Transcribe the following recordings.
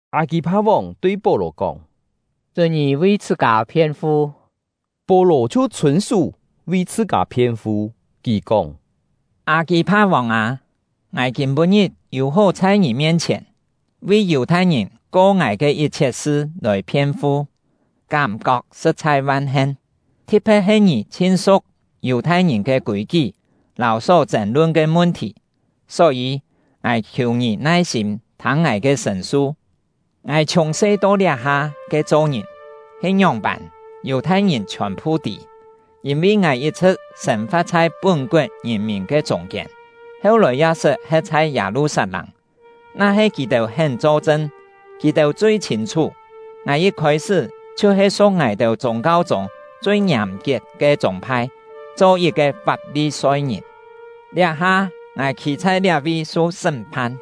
Â-kî-pha-vòng tui Pó-lò kóng: “Chún ngì vi chhṳ-kâ phien-fu.” Pó-lò chhiu chhûn-sú, vi chhṳ-kâ phien-fu. Kì kóng: “Â-kî-pha-vòng â, ngài kîm-pû-ngit yû hó chhai ngì mien-chhièn, vi Yù-thai-ngìn ko ngài ke yit-chhiet sṳ lòi phien-fu, kám-kok sṳ̍t-chhai van-hen! Thi̍t-phe̍t he ngì chhin su̍k Yù-thai-ngìn ke kûi-kí lâu só chên-lun ke mun-thì. Só-yî, ngài khiù ngì nai-sîm thâng ngài ke sṳ̂n-su. “Ngài chhiùng-se to liá-ha ke cho-ngìn he ngióng-pân, Yù-thai-ngìn chhiòn-phu tî, yîn-vi ngài yit-chhṳ̍t sên-fa̍t chhai pún-koet ngìn-mìn ke chûng-kiên, heu-lòi ya sṳt he̍t chhai Yâ-lu-sat-lâng. Na-he kì-têu hén cho-chṳn, kì-têu chui chhîn-chhú, ngài yit khôi-sṳ́ chhiu-he su̍k ngài-têu chûng-kau-chûng chui ngiàm-kiet ke chûng-phai, cho yit-ke Fap-li-soi-ngìn. Liá-ha ngài khî chhai liá-vi su sṳ́m-phan,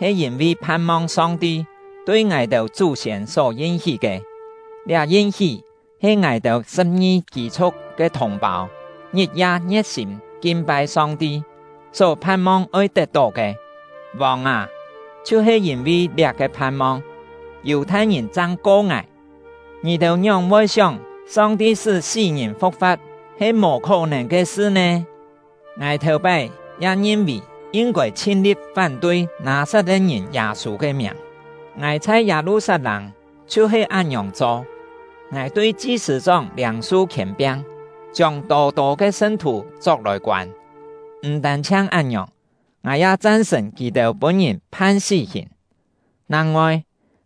he yîn-vi phan-mong Song-ti tui ngài-têu chú-siên só yin-hí ke. Liá yin-hí he ngài-têu sṳ̍p-ngi kî-chhu̍k ke thùng-pâu ngit-ya ngie̍t-sîm kin-pai Song-ti, só phan-mong oi tet-tó ke. Vòng â, chhiu-he yîn-vi liá-ke phan-mong, Yù-thai-ngìn chang ko ngài! Ngì-têu ngióng-voi sióng Song-ti sṳ́ sí-ngìn fu̍k-fa̍t he mò khó-nèn ke sṳ nè? “Ngài thèu-pái ya ngin-vì yin-kôi chhin-li̍t fán-tui Nâ-sat-le̍t-ngìn Yâ-sû ke miàng. Ngài chhai Yâ-lu-sat-lâng chhiu-he án-ngiòng cho. Ngài tui chi-sṳ̂-chóng liâng-su khièn-piang, chiông tô-tô ke sṳn-thù chok-lòi koân; m̀ tân-chhiang án-ngiòng, ngài ya chan-sṳ̀n kì-têu pûn-ngìn phan sí-hìn. Nang-ngoi,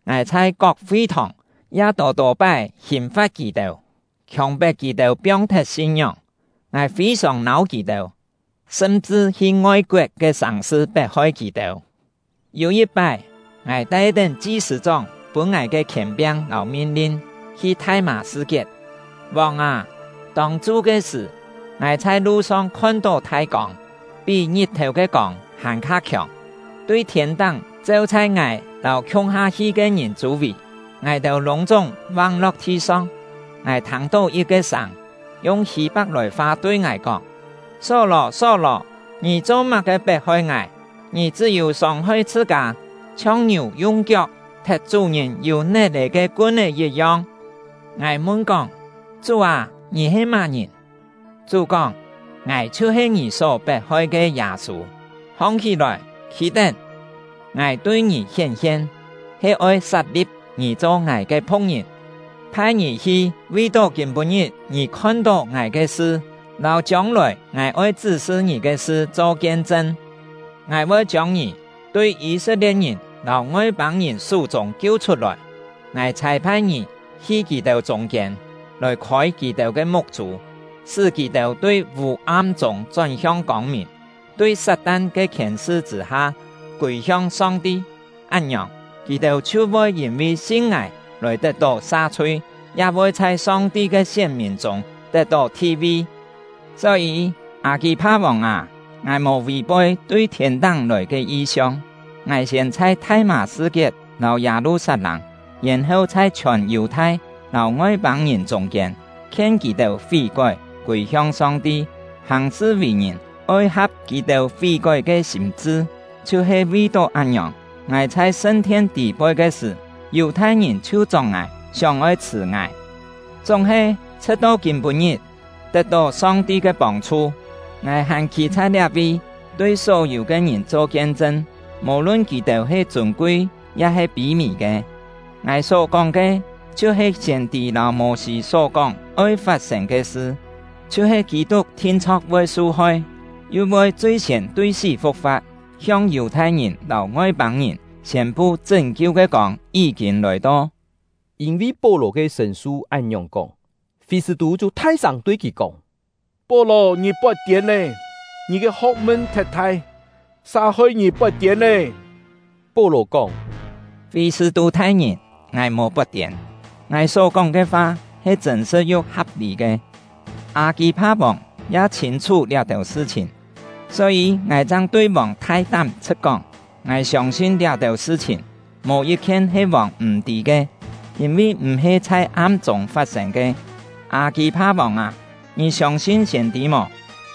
ngài chhai kok fi-thòng ya tô-tô pái hìn-fa̍t kì-têu, khiòng-pet kì-têu piong-thet sin-ngióng. Ngài fî-sòng nâu kì-têu, sṳm-chṳ hi ngoi-koet ke sàng-sṳ pet-hoi kì-têu. “Yû yit-pái, ngài tai-tén chi-sṳ̂-chóng pûn ngài ke khièn-piang lâu min-lin hi Thai-mâ-sṳ-kiet. Vòng â, tông-chu ke sṳ̀, ngài chhai lu-song khon-tó thai kông, pí ngit-thèu ke kông hàn-kha khiòng, tui thiên-táng cheu chhai ngài lâu khiung-ha hi ke ngìn chû-vì. Ngài-têu lûng-chúng vang-lo̍k thi-song. Ngài thâng-tó yit-ke sâng, yung Hî-pak-lòi-fa tui ngài kóng: ‘Só-lò, Só-lò! Ngì cho-má-ke pet-hoi ngài? Ngì chṳ́-yû sông-hoi chhṳ-kâ, chhiong ngiù yung kiok thet chú-ngìn yû net-è ke kun-é yit-yong.’ Ngài mun-kóng: ‘Chú â, ngì he má-ngìn?’ Chú kóng: ‘Ngài chhiu-he ngì só pet-hoi ke Yâ-sû. Hong-hí-lòi, khî-tén! Ngài tui ngì hién-hien he oi sat-li̍p ngì cho ngài ke phu̍k-ngìn, phai ngì hi vi-tó kîm-pû-ngit ngì khon-tó ngài ke sṳ lâu chiông-lòi ngài oi chṳ́-sṳ ngì ke sṳ cho kien-chṳn. Ngài voi chiông ngì tui Yî-set-lie̍t-ngìn lâu Ngoi-pâng-ngìn sú-chûng kiu-chhut-lòi. Ngài chhâi-phai ngì hi kì-têu chûng-kiên, lòi khôi kì-têu ke muk-chû, sṳ́ kì-têu tui vû-am chûng chón-hiong kông-mìn, tui Sat-tan ke khièn-sṳ chṳ̂-ha kûi-hiong Song-ti; án-ngiòng, kì-têu chhiu voi yîn-vi sin ngài lòi tet-tó sa-chhui, ya voi chhai Song-ti ke sién-mìn chûng tet-tó thi-vi.’ “Só-yî, Â-kî-pha-vòng â, ngài mò vì-poi tui thiên-táng lòi ke yi-siong. Ngài siên chhai Thai-mâ-sṳ-kiet lâu Yâ-lu-sat-lâng, yèn-heu chhai chhiòn Yù-thai lâu Ngoi-pâng-ngìn chûng-kiên khien kì-têu fí-kói, kûi-hiong Song-ti, hàng-sṳ vì-ngìn oi ha̍p kì-têu fí-kói ke sîm-chṳ. Chhiu-he vi-tó án-ngiòng, ngài chhai sṳn-thien tî-poi ke sṳ̀, Yù-thai-ngìn chhiu chok ngài, sióng-oi chhṳ̀ ngài. Chúng-he, chhṳ̍t-to kîm-pû-ngit, tet-tó Song-ti ke pông-chhu, ngài hàn khî chhai liá-vi, tui só-yû ke ngìn cho kien-chṳn, mò-lun kì-têu he chûn-kui ya-he pî-mì ke. Ngài só-kóng ke chhiu-he siên-tî lâu Mô-sî só-kóng oi fat-sên ke sṳ, chhiu-he Kî-tuk thin-chho̍k voi su-hoi, yu voi chui-siên tui sí fu̍k-fa̍t, hiong Yù-thai-ngìn lâu Ngoi-pâng-ngìn siên-pu chṳ́n-kiu ke kông yí-kîn lòi-to.” Yîn-vi Pó-lò ke sṳ̂n-su án-ngiòng kóng, Fî-sṳ̂-tû chhiu thai-sâng tui kì kóng: “Pó-lò, ngì pot-tiên lé! Ngì ke ho̍k-mun thet thai, sa hoi ngì pot-tiên lê!” Pó-lò kóng: “Fî-sṳ̂-tû thai-ngìn! Ngài mò pot-tiên; ngài só-kóng ke fa he chṳ̂n-sṳ̍t yu ha̍p-lî ke. Â-kî-pha-vòng ya chhîn-chhú liá-têu sṳ-chhìn, só-yî ngài chang tui vòng thai-tám chhṳ̍t-kóng. Ngài siông-sin liá-têu sṳ-chhìn, mò yit-khien he vòng m̀-tî ke, yîn-vi m̀-he chhai am-chûng fat-sên ke. Â-kî-pha-vòng â, ngì siông-sin siên-tî mò?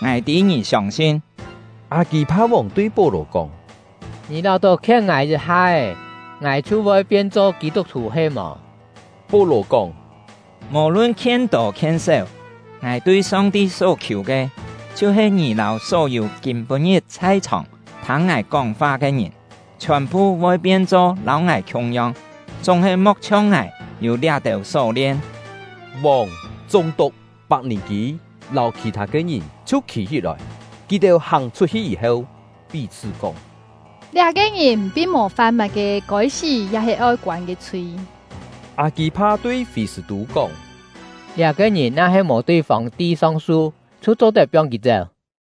Ngài tî ngì siông-sin!” Â-kî-pha-vòng tui Pó-lò kóng: “Ngì láu-tó khien ngài yit-ha-é, ngài chhiu voi pien-cho Kî-tuk-thù he-mò?” Pó-lò kóng: “Mò-lun khien tô khien séu, ngài tui Song-ti só-khiù ke, chhiu-he ngì lâu só-yû kîm-pû-ngit chhai-chhòng thâng ngài kóng-fa ke ngìn, chhiòn-phu voi pien-cho lâu ngài khiung-yong, chúng-he mo̍k chhiong ngài yû liá-têu só-lien!” Vòng, chúng-tuk, Pak-nì-kî, lâu khì-thâ ke ngìn chhiu khî-hí-lòi. Kì-têu hàng chhut-hi yî-heu, pí-chhṳ́ kóng: “Liá-ke ngìn pin mò fam má-ke kôi-sí ya-he oi koân ke chhui.” Â-kî-pha tui Fî-sṳ̂-tû kóng: “Liá-ke ngìn na-he mò tui Fòng-ti song-su, chhiu cho-tet piong kì chéu.”